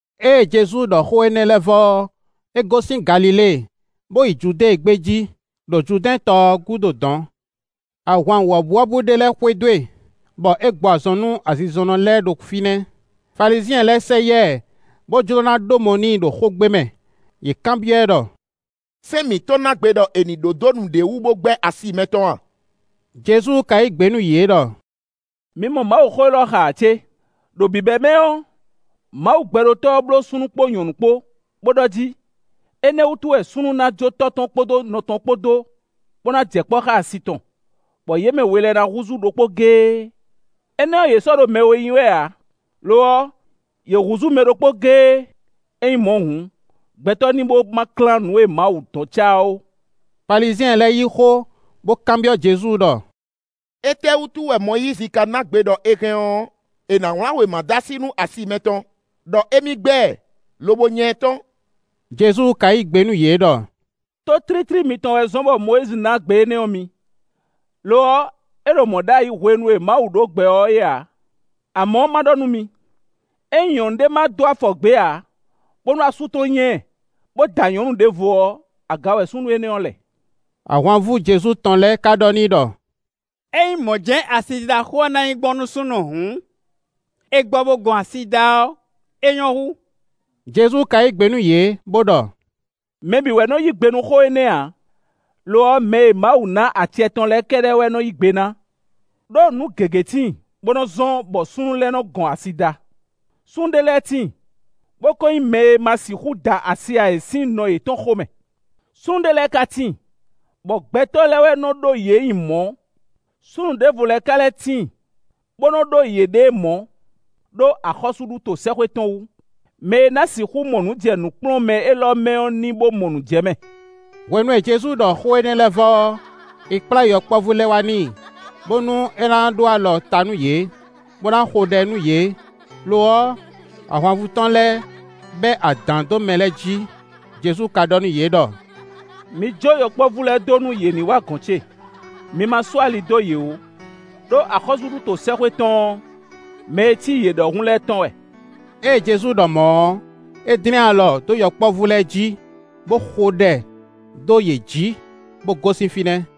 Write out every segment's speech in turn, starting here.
Ée Jezu ɖɔ xó énɛ́ lɛ́ɛ vɔ ɔ́, é gosín Galilée, bó yi Judée gbé jí, ɖo Judɛ́ɛn tɔ ɔ́ gúdo dɔ̌n. Ahwan wɔ̌buwɔ́bú ɖé lɛ́ɛ xwedó e, bɔ é gbɔ azɔn nú azinzɔnnɔ lɛ́ɛ ɖo fínɛ́. Falizyɛn lɛ́ɛ sɛ yá ɛ, bó jló ná ɖó mɔ n'i ɖo xógbe mɛ; yě kanbyɔ́ ɛ ɖɔ: “Sɛ́n mǐtɔn ná gbe ɖɔ è ní ɖó dó nǔɖé wú, bó gbɛ́ asi mɛtɔn a?” Jezu ka yí gbe nú yě ɖɔ: “Mi mɔ Mawuxó élɔ́ xa ǎ cé? ‘Ɖo bǐbɛ́mɛ ɔ́, Mawu Gbɛɖótɔ́ ɔ́ bló súnnu kpó nyɔ̌nu kpó, bó ɖɔ jí, énɛ́ wútu wɛ súnnu ná jó tɔ́ tɔn kpódó nɔ tɔn kpó dó, bó ná jɛ kpɔ́ xá asi tɔn, bɔ yě mɛ we lɛ́ɛ ná húzú ɖokpó géé.’ Énɛ́ ɔ́, yě sɔ́ ɖo mɛ we nyí wɛ ǎ, lo ɔ́, yě húzú mɛ ɖokpó géé. Ényí mɔ̌ hǔn, gbɛtɔ́ ní bó ma klán nǔ e Mawu dɔn cá ɔ́ ó.” Falizyɛn lɛ́ɛ yí xó, bó kanbyɔ́ Jezu ɖɔ: “Étɛ́wútu wɛ Mɔyízi ka ná gbe ɖɔ è hɛn ɔ́, è nǎ wlán wěma dó así nú asi mɛtɔn, ɖɔ émí gbɛ́ ɛ, lobo nya ɛ tɔ́n?” Jezu ka yí gbe nú yě ɖɔ: “Tó tlítlí mitɔn wɛ zɔ́n bɔ Mɔyízi ná gbe énɛ́ ɔ́ mi. Lo ɔ́, é ɖo mɔ̌ ɖ'ayǐ hwenu e Mawu ɖó gbɛ ɔ́ é ǎ. Amɔ̌, má ɖɔ nú mi: ‘Ényí nyɔ̌nu ɖé ma dó afɔ gbě ǎ, bónú asú tɔn nya ɛ, bó da nyɔ̌nu ɖěvo ɔ́, aga wɛ súnnu énɛ́ ɔ́ lɛ.’” Ahwanvú Jezu tɔn lɛ́ɛ ka ɖɔ n'i ɖɔ: “Ényí mɔ̌ jɛ́n wɛ asidida xó ɔ́ ná nyí gbɔn nú súnnu hǔn, è gbɔ bo gɔn asi da ɔ́, é nyɔ́ hú.” Jezu ka yí gbe nú yě bó ɖɔ: “Mɛ bǐ wɛ nɔ yí gbe nú xó énɛ́ ǎ; lo ɔ́, mɛ e Mawu ná acɛ tɔn lɛ́ɛ kɛ́ɖɛ́ wɛ nɔ yí gbe ná. Ɖó nǔ gěgé tíin, bó nɔ́ zɔ́n, bɔ súnnu lɛ́ɛ nɔ́ gɔn asi da: súnnu ɖé lɛ́ɛ tíin, bó ko nyí mɛ e ma sixú da asi ǎ é sín nɔ yětɔn xomɛ; súnnu ɖé lɛ́ɛ ka tíin, bɔ gbɛtɔ́ lɛ́ɛ wɛ nɔ́ ɖó yě nyi mɔ̌; súnnu ɖěvo lɛ́ɛ ka lɛ́ tíin, bó nɔ́ ɖó yěɖée mɔ̌, ɖó axɔ́súɖuto sɛ́xwé tɔn wú. Mɛ e ná sixú mɔ nǔ jɛ nǔkplɔ́nmɛ élɔ́ mɛ ɔ́ ní bó mɔ nǔ jɛ mɛ.” Hwenu e Jezu ɖɔ xó énɛ́ lɛ́ɛ vɔ ɔ́, è kplá yɔkpɔ́vú lɛ́ɛ wá n'i, bónú é ná ɖó alɔ ta nú yě, bó ná xo ɖɛ nú yě. Lo ɔ́, ahwanvú tɔn lɛ́ɛ bɛ́ adǎn dó mɛ lɛ́ɛ jí. Jezu ka ɖɔ nú yě ɖɔ: “Mi jó yɔkpɔ́vú lɛ́ɛ dó nú yě ní wǎ gɔ̌n ce; mi ma sú ali dó yě ó; ɖó axɔ́súɖuto sɛ́xwé tɔn ɔ́, mɛ e cí yě ɖɔhun lɛ́ɛ tɔn wɛ.” Ée Jezu ɖɔ mɔ̌ ɔ́, é dlɛ́n alɔ dó yɔkpɔ́vú lɛ́ɛ jí, bó xo ɖɛ dó yě jí, bó gosín fínɛ́.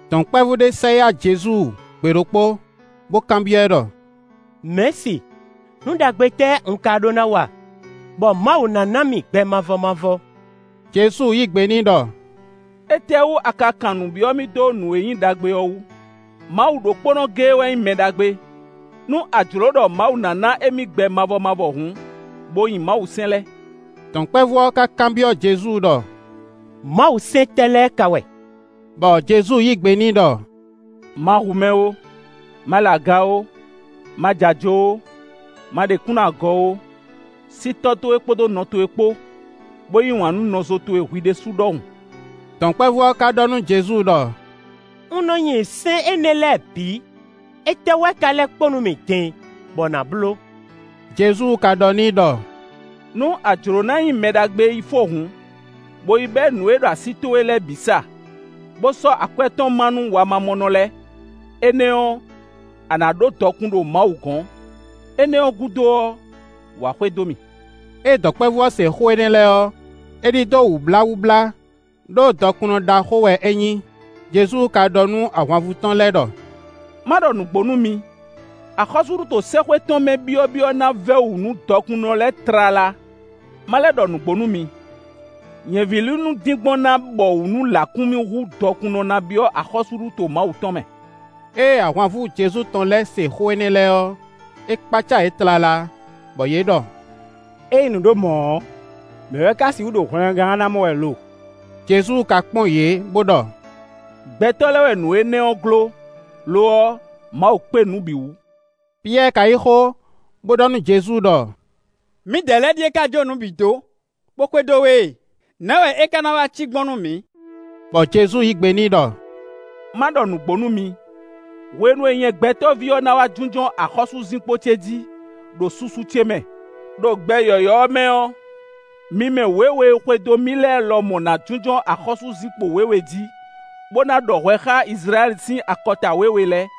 Dɔ̌nkpɛvú ɖé sɛ yá Jezu gbe ɖokpó, bó kanbyɔ́ ɛ ɖɔ: “Mɛ̌si nǔ ɖagbe tɛ́ un ka ɖó ná wa, bɔ Mawu ná ná mì gbɛ mavɔ mavɔ?” Jezu yí gbe n'i ɖɔ: “Étɛ́wú a ka kan nǔ byɔ́ mì dó nǔ e nyí ɖagbe ɔ́ wú? Mawu ɖokpónɔ géé wɛ nyí mɛ ɖagbe. Nú a jlǒ ɖɔ Mawu ná ná émí gbɛ mavɔ mavɔ hǔn, bo nyi Mawusɛ́n lɛ́ɛ.” Dɔ̌nkpɛvú ɔ́ ka kanbyɔ́ Jezu ɖɔ: “Mawusɛ́n tɛ́ lɛ́ɛ ka wɛ?” Bɔ Jezu yí gbe n'i ɖɔ: “Ma hu mɛ ó, ma lɛ aga ó, ma ja ajo ó, ma ɖe kúnnu agɔ ó, sí tɔ́ towe kpódó nɔ towe kpó, bó yí wǎn nú nɔzo towe hwi ɖésú ɖɔhun.” Dɔ̌nkpɛvú ɔ́ ka ɖɔ nú Jezu ɖɔ: “Un nɔ nyi sɛ́n énɛ́ lɛ́ɛ bǐ; étɛ́ wɛ ka lɛ́ kpo nú mì din bɔ nǎ bló?” Jezu ka ɖɔ n'i ɖɔ: “Nú a jlǒ ná nyí mɛ ɖagbe yi fó hǔn, bo yi bɛ́ nǔ e ɖo así towe lɛ́ɛ bǐ sa, bó sɔ́ akwɛ́ tɔn má nú wamamɔnɔ lɛ́ɛ; énɛ́ ɔ́, a nǎ ɖó dɔkun ɖo Mawu gɔ́n. Énɛ́ ɔ́ gúdo ɔ́, wǎ xwedó mì.” Ée dɔ̌nkpɛvú ɔ́ se xó énɛ́ lɛ́ɛ ɔ́, é ɖidó wǔbláwúblá, ɖó dɔkunnɔ ɖaxó wɛ é nyí. Jezu ka ɖɔ nú ahwanvú tɔn lɛ́ɛ ɖɔ: “Má ɖɔ nǔgbó nú mi; axɔ́súɖuto sɛ́xwé tɔn mɛ byɔ́byɔ́ ná vɛ́ wǔ nú dɔkunnɔ lɛ́ɛ tlala. Má lɛ́ ɖɔ nǔgbó nú mi: nyɛ̌vílinu dín gbɔn ná bɔwǔ nú lǎkúnmí hú dɔkunnɔ ná byɔ́ axɔ́súɖuto Mawu tɔn mɛ.” Ée ahwanvú Jezu tɔn lɛ́ɛ se xó énɛ́ lɛ́ɛ ɔ́, é kpácá yě tlala, bɔ yě ɖɔ: “Ényí nǔ ɖo mɔ̌ ɔ́, mɛ̌ wɛ ka sixú ɖo hwlɛngán ɔ́ ná mɔ wɛ lo?” Jezu ka kpɔ́n yě bó ɖɔ: “Gbɛtɔ́ lɛ́ɛ wɛ nǔ énɛ́ ɔ́ gló; lo ɔ́, Mawu kpé nǔ bǐ wú.” Piyɛ́ɛ ka yí xó, bó ɖɔ nú Jezu ɖɔ: “Mǐdɛɛ lɛ́ɛ ɖíe ka jó nǔ bǐ dó, bó xwedó we e; nɛ̌ wɛ é ka ná wá cí gbɔn nú mǐ?” Bɔ Jezu yí gbe n'i ɖɔ: “Má ɖɔ nǔgbó nú mi: hwenu e nyɛ Gbɛtɔ́ví ɔ́ ná wá jínjɔ́n axɔ́súzinkpo ce jí, ɖo susu ce mɛ, ɖo gbɛ yɔ̌yɔ́ ɔ́ mɛ ɔ́, mi mɛ wěwe e xwedó mì lɛ́ɛ lɔmɔ̌ ná jínjɔ́n axɔ́súzinkpo wěwe jí, bó ná ɖɔ hwɛ xá Izlayɛ́li sín akɔta wěwe lɛ́ɛ,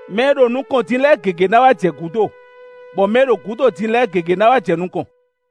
Mɛ e ɖo nukɔn din lɛ́ɛ gěgé ná wá jɛ gǔdo, bɔ mɛ e ɖo gǔdo din lɛ́ɛ gěgé ná wá jɛ nukɔn.”